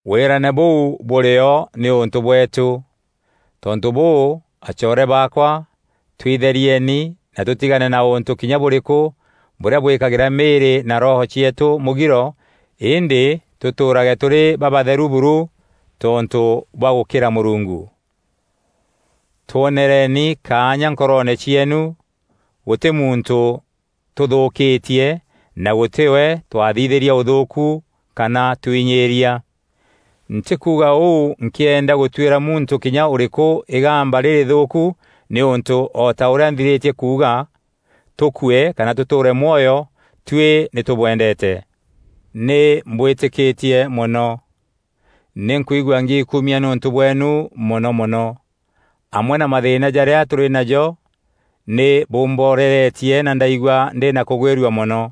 Wîrane bûu bûrî o nîûntû bweetû. Tontû bûû, acoore baakwa twitherieni na tûtigane na ûntû kinya bûrîkû bûrîa bwîkagîra mîîrî na roho cieetû mûgiro îndî tûtûûrage tûrî babatheru buru tontû bwa gûkîra Mûrungu. Twonereni kaanya nkoroone cieenu; gûtî muntû tûthûûkîtie na gûtî we twathithîrîa ûthûûku kana tûinyîîria. Ntîkuuga ûu nkîenda gûtwîra muntû kinya ûrîkû îgamba rîrîthûûku nîûntû o ta ûrîa nthirîtie kuuga, tûkue kana tûtûûre mwoyo, tuî nî tûbwendeete. Nî mbwîtîkîtie mono; nî nkwigua ngiikumia nîûntû bweenu mono mono. Amwe na mathîîna jarîa tûrî najo nî bûmboreretie na ndaigua ndî na kûgwîrua mono.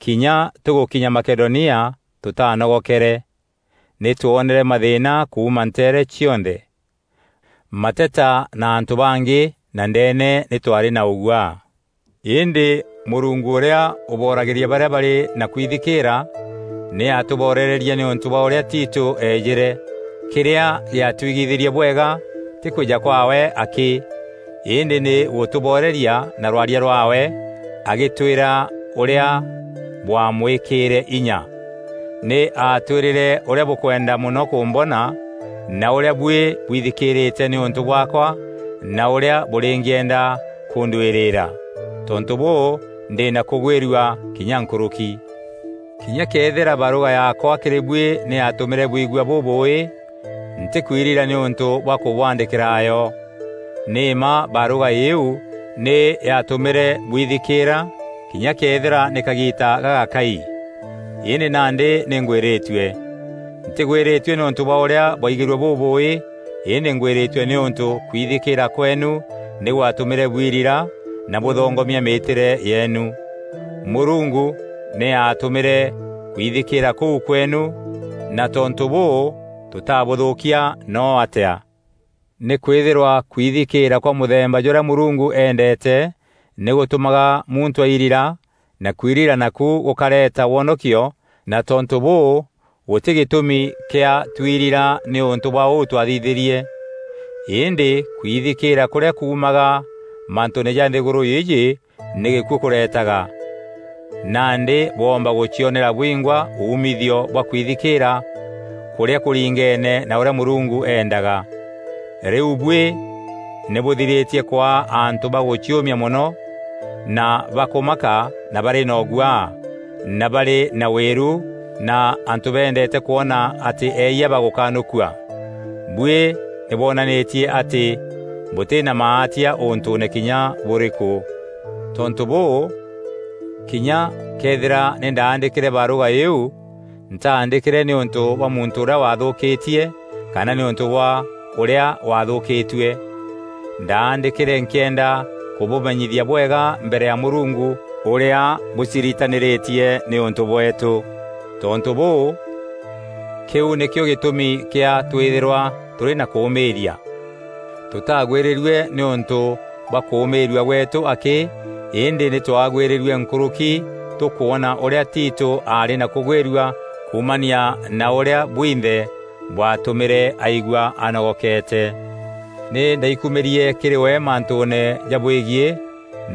Kinya tûgûkinya Makedonia tûtaanogokere. Nî twonere mathîîna kuuma nteere cionthe: mateta na antû bangî na ndeene nî twaarî na ûguaa. Îndî Mûrungu ûrîa ûboragîria barîa barî na kwithikîîra, nî aatûborerie nîûntû bwa ûrîa Tito eejîre. Kîrîa gîatwigithîrie bwega tî kwîja kwaawe akî, îndî nî gûtûboreria na rwaria rwaawe agîtwîra ûrîa bwamwîkîîre inya. Nî aatwîrîre ûrîa bûkwenda mono kûmbona na ûrîa buî bwithikîîrîte nîûntû bwaakwa na ûrîa bûrîngîenda kûndwîrîîra. Tontû bûû ndî na kûgwîrua kinya nkûrûki. Kinya këethîra barûga yaakwa kîrî buî nî yaatûmîre bwigua bûbûûî, ntîkwirira nîûntû bwa kûbwaandîkîra yo. Nî mma barûga îîu nî yatûmîre bwithikîîra kinya këethîra nî kagiita gagakai. Îndî nandî nî ngwîrîtue. Ntîgwîrîtue nîûntû bwa ûrîa bwaigîrue bûbûûî îndî ngwîrîtue nîûntû kwithikîîra kweenu nî gwatûmîre bwirira na bûthongomia mîîtîre yeenu. Mûrungu nî aatumîîre kwithikîîra kûu kweenu na tontû bûû tûtabûthûûkia noo atîa. Nîkwîthîrwa kwithikîîra kwa mûthemba jûrîa Mûrungu eendeete nî gûtûmaga muntû airira na kwirira naku gûkareeta wonokio na tontû bûû gûtî gîtûmi kîa twirira nîûntû bwa ûu twaathithîrie. Îndî kwithikîîra kûrîa kuumaga mantûûne ja nthîgûrû îîjî nî gîkuû kûretaga. Nandî bwoomba gûcionera bwingwa umithio bwa kwithikîîra kûrîa kûringeene na ûrîa Mûrungu eendaga. Rîu buî nî bûthirîtie kwaa antû ba gûciûmia mono na bakûmaka na barî na ûguaa na barî na wîru na antû bendeete kwona atî eeyia bagûkanûkua. Buî nî bwonanîtie atî bûtî na maatia ûntûûne kinya bûrîkû. Tontû bûû, kinya këethîra nî ndaandîkîre barûga îîu, ntaandîkîre nîûntû bwa muntû ûrîa waathûûkîtie kana nîûntû bwa ûrîa waathûûkîtue. Ndaandîkîre nkîenda kûbûmenyithia bwega mbere ya Mûrungu ûrîa bûciritanîrîtie nîûntû bweetû. Tontû bûû kîu nîkîo gîtûmi kîa twîthîrwa tûrî na kûûmîîria. Tûtagwîrîrue nîûntû bwa kûûmîîrua gweetû akî îndî nî twaagwîrîrue nkûrûki tûkwona ûrîa Tito aarî na kûgwîrua kuumania na ûrîa bwinthe bwaatûmîre aigua anogokeete. Nî ndaikumîrie kîrî we mantûûne jabwegiî,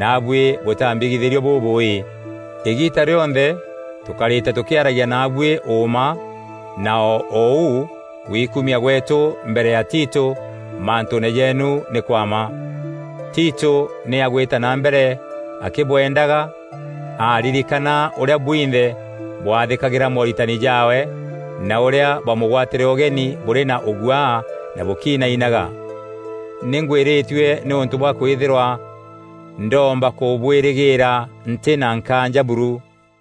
naabuî bûtambigithîrie bûbûûî. Îgiita rîonthe tûkarîte tûkîaragia naabuî ûûma na o ûu gwikumia gweetû mbere ya Tito mantûûne jeenu nî kwa mma. Tito nî agwîta na mbere akîbwendaga aaririkana ûrîa bwinthe bwaathîkagîra mooritani jaawe na ûrîa bwamûgwatîre ûgeni bûrî na ûguaa na bûkinainaga. Nî ngwîrîtue nîûntû bwa kwîthîrwa ndoomba kûbwîrîgîîra ntî na nkaanja buru.